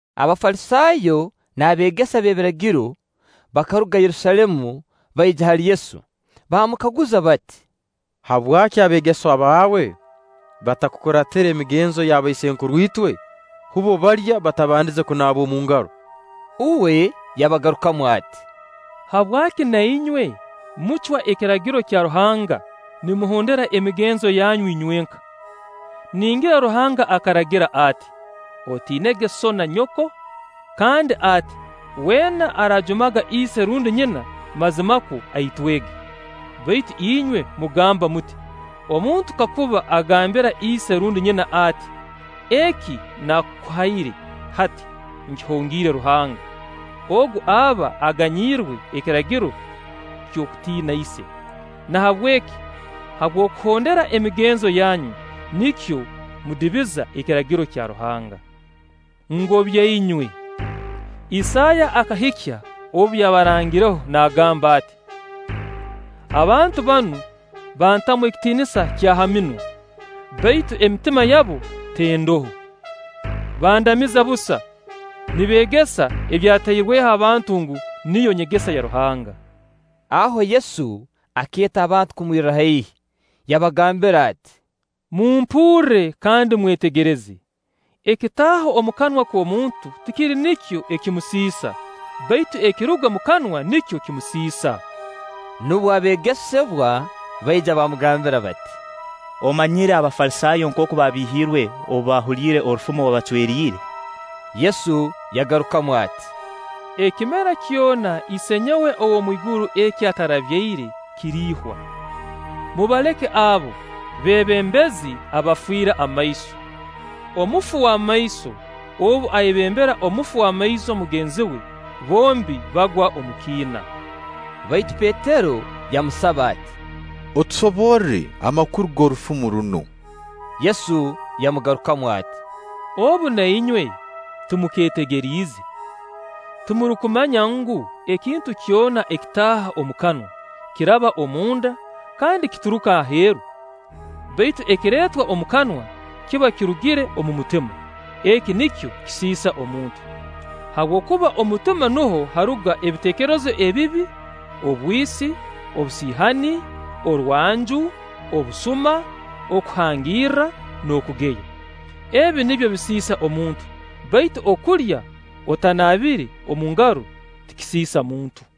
Abafalisaayo n'abeegesa b'ebiragiro bakaruga Yerusaalemu baija hali Yesu baamukaguza bati: “Habwaki abeegesebwa baawe batakuraatira migenzo y'abaisenkuruitwe? Bbo balya batabandize kunaaba omu ngaro.” Uwe yabagarukamu ati: “Habwaki na inywe mucwa Ekiragiro kya Ruhanga nimuhondera emigenzo yanyu inywenka? Ningira Ruhanga akaragira ati: ‘Otiinege sso na nyoko’; kandi ati: ‘Weena araajumaga ise rundi nyina mazimakwo aitwege.’ Baitu inywe mugamba muti: ‘Omuntu kakuba agambira ise rundi nyina ati: Eki naakukuhaire, hati nkihongiire Ruhanga; ogu aba aganyirwe Ekiragiro ky'okutiina ise.’ Nahabweki habw'okuhondera emigenzo yanyu, nikyo mudibiza Ekiragiro kya Ruhanga. Ngobya inywe! Isaaya akahikya obu yabarangireho naagamba ati: ‘Abantu banu bantamu ekitiinisa kya ha minwa, baitu emitima yabu tendoho; bandamiza busa, nibeegesa ebyatairweho abantu ngu, niyo nyegesa ya Ruhanga’.” Aho Yesu akeeta abantu kumwirra haihi, yabagambira ati: “Mumpurre kandi mwetegereze: ekitaaha omu kanwa k'omuntu, tikiri nikyo ekimusiisa; baitu ekiruga omu kanwa, nikyo kimusiisa.” Nubwo abeegesebwa baija bamugambira bati: “Omanyire Abafalisaayo nkooku babiihiirwe obu baahuliire orufumo obacweriire?” Yesu yagarukamu ati: “Ekimera kyona Isenyowe ow'omu iguru eki atarabyaire, kiriihwa. Mubaleke abo, beebembezi abafiire amaiso. Omufu w'amaiso obu ayebembera omufu w'amaiso mugenzi we, bombi bagwa omu kiina.” Baitu Petero yamusaba ati: “Otusoborre amakuru g'orufumo runu'” Yesu yamugarukamu ati: “Obu na inywe timukeetegeriize? Timurukumanya ngu, ekintu kyona ekitaaha omu kanwa, kiraba omu nda, kandi kituruka aheeru? Baitu ekireetwa omu kanwa kiba kirugire omu mutima; eki nikyo kisiisa omuntu. Habwokuba omu mutima nuho haruga ebiteekerezo ebibi, obwisi, obusiihani, orwanju, obusuma, okuhangirra, n'okugeya. Ebi nibyo bisiisa omuntu; baitu okulya otanaabire omu ngaro tikisiisa muntu.”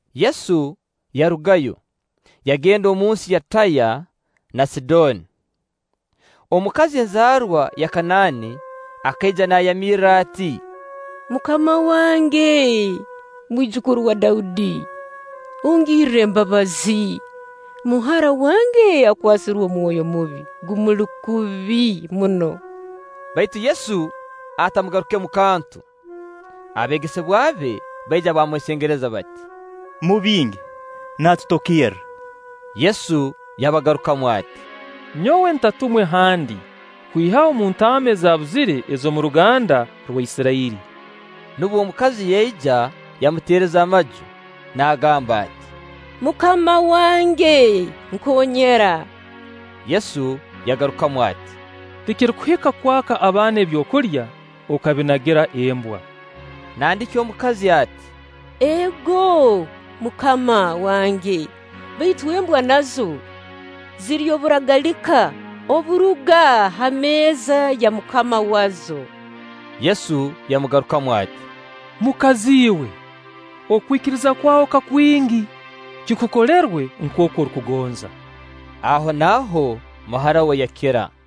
Yesu yarugayo, yagenda omunsi ya Taya na Sidooni. Omukazi enzaarwa ya Kanaani, akaija naayamirra ati: “MUKAMA wange, Mwijukuru wa Daudi, ongirre embabazi; muhara wange akwasirwe omwoyo mubi, gumuli kubi muno.” Baitu Yesu atamugarukemu kantu. Abeegesebwa be baija baamwesengereza bati: “Mubinge, naatutokerra.” Yesu yabagarukamu ati: “Nyowe ntatumwe handi kwihaho omu ntaama ezaabuzire ez'omu ruganda rwa Isirairi.” Nubwo mukazi yaija yamuteereza amaju, naagamba ati: “MUKAMA wange, nkoonyera.” Yesu yagarukamu ati: “Tikirukuhika kwaka abaana ebyokulya okabinagira embwa.” Nandiki omukazi ati: “Ego, MUKAMA wange, baitu embwa nazo zirya oburagalika oburuga ha meeza ya mukama wazo.” Yesu yamugarukamu ati: “Mukazi iwe, okwikiriza kwawe ka kwingi! Kikukolerwe nkooku orukugonza.” Ahonaaho muhara we yakira.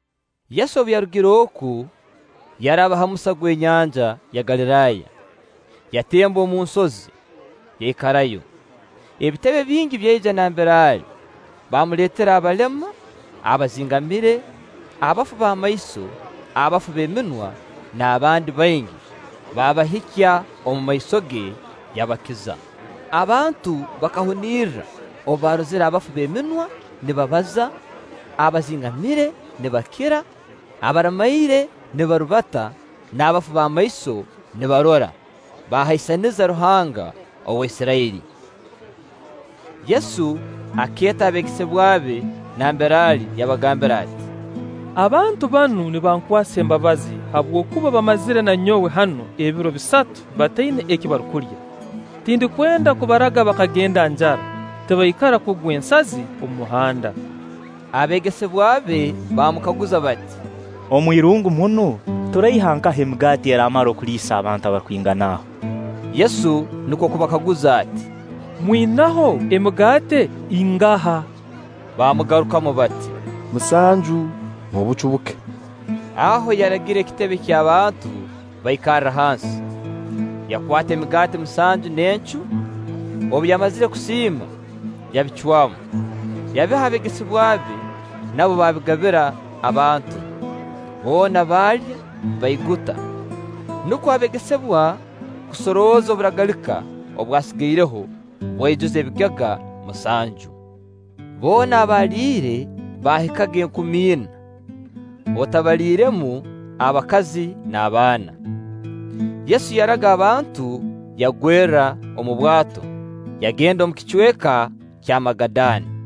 Yesu obu yarugire oku, yaraba ha musa gw'enyanja ya Galiraaya. Yatemba omu nsozi, yaikarayo. Ebitebe bingi byaija nambere ali, baamuleetera abalema, abazingamire, abafu b'amaiso, abafu b'eminwa n'abandi baingi. Baabahikya omumaiso ge, yabakiza. Abantu bakahunirra obu baarozire abafu b'eminwa nibabaza, abazingamire nibakira, abaramaire nibarubata, n'abafu b'amaiso nibarora; baahaisaniza Ruhanga wa Isirairi. Yesu akeeta abeegesebwa be nambere ali yabagambira ati: “Abantu banu nibankwasa embabazi habwokuba baamazire na nyowe hanu ebiro bisatu bataina eki barukulya; tindukwenda kubaraga bakagenda njara, tibaikara kugwa ensazi omu muhanda.” Abeegesebwa be baamukaguza bati: “Omwirungu munu turaiha nkaha emigaati eraamara kuliisa abantu abarukwingana aho?” Yesu nukwo kubakaguza ati: “Mwinaho emigaati ingaha?” Baamugarukamu bati: “Musanju n'obucu buke.” Aho yaragira ekitebe ky'abantu baikarre hansi, yakwata emigaati musanju n'encu, obu yamazire kusiima, yabicwamu, yabiha abeegesebwa be, nabo baabigabira abantu. Boona baalya, baiguta; nukwo abeegesebwa kusorooza oburagalika obwasigaireho, bwaijuza ebigega musanju. Boona abaaliire baahikaga enkumi ina, otabaliiremu abakazi n'abaana. Yesu yaraga abantu, yagwerra omu bwato, yagenda omu kicweka kya Magadani.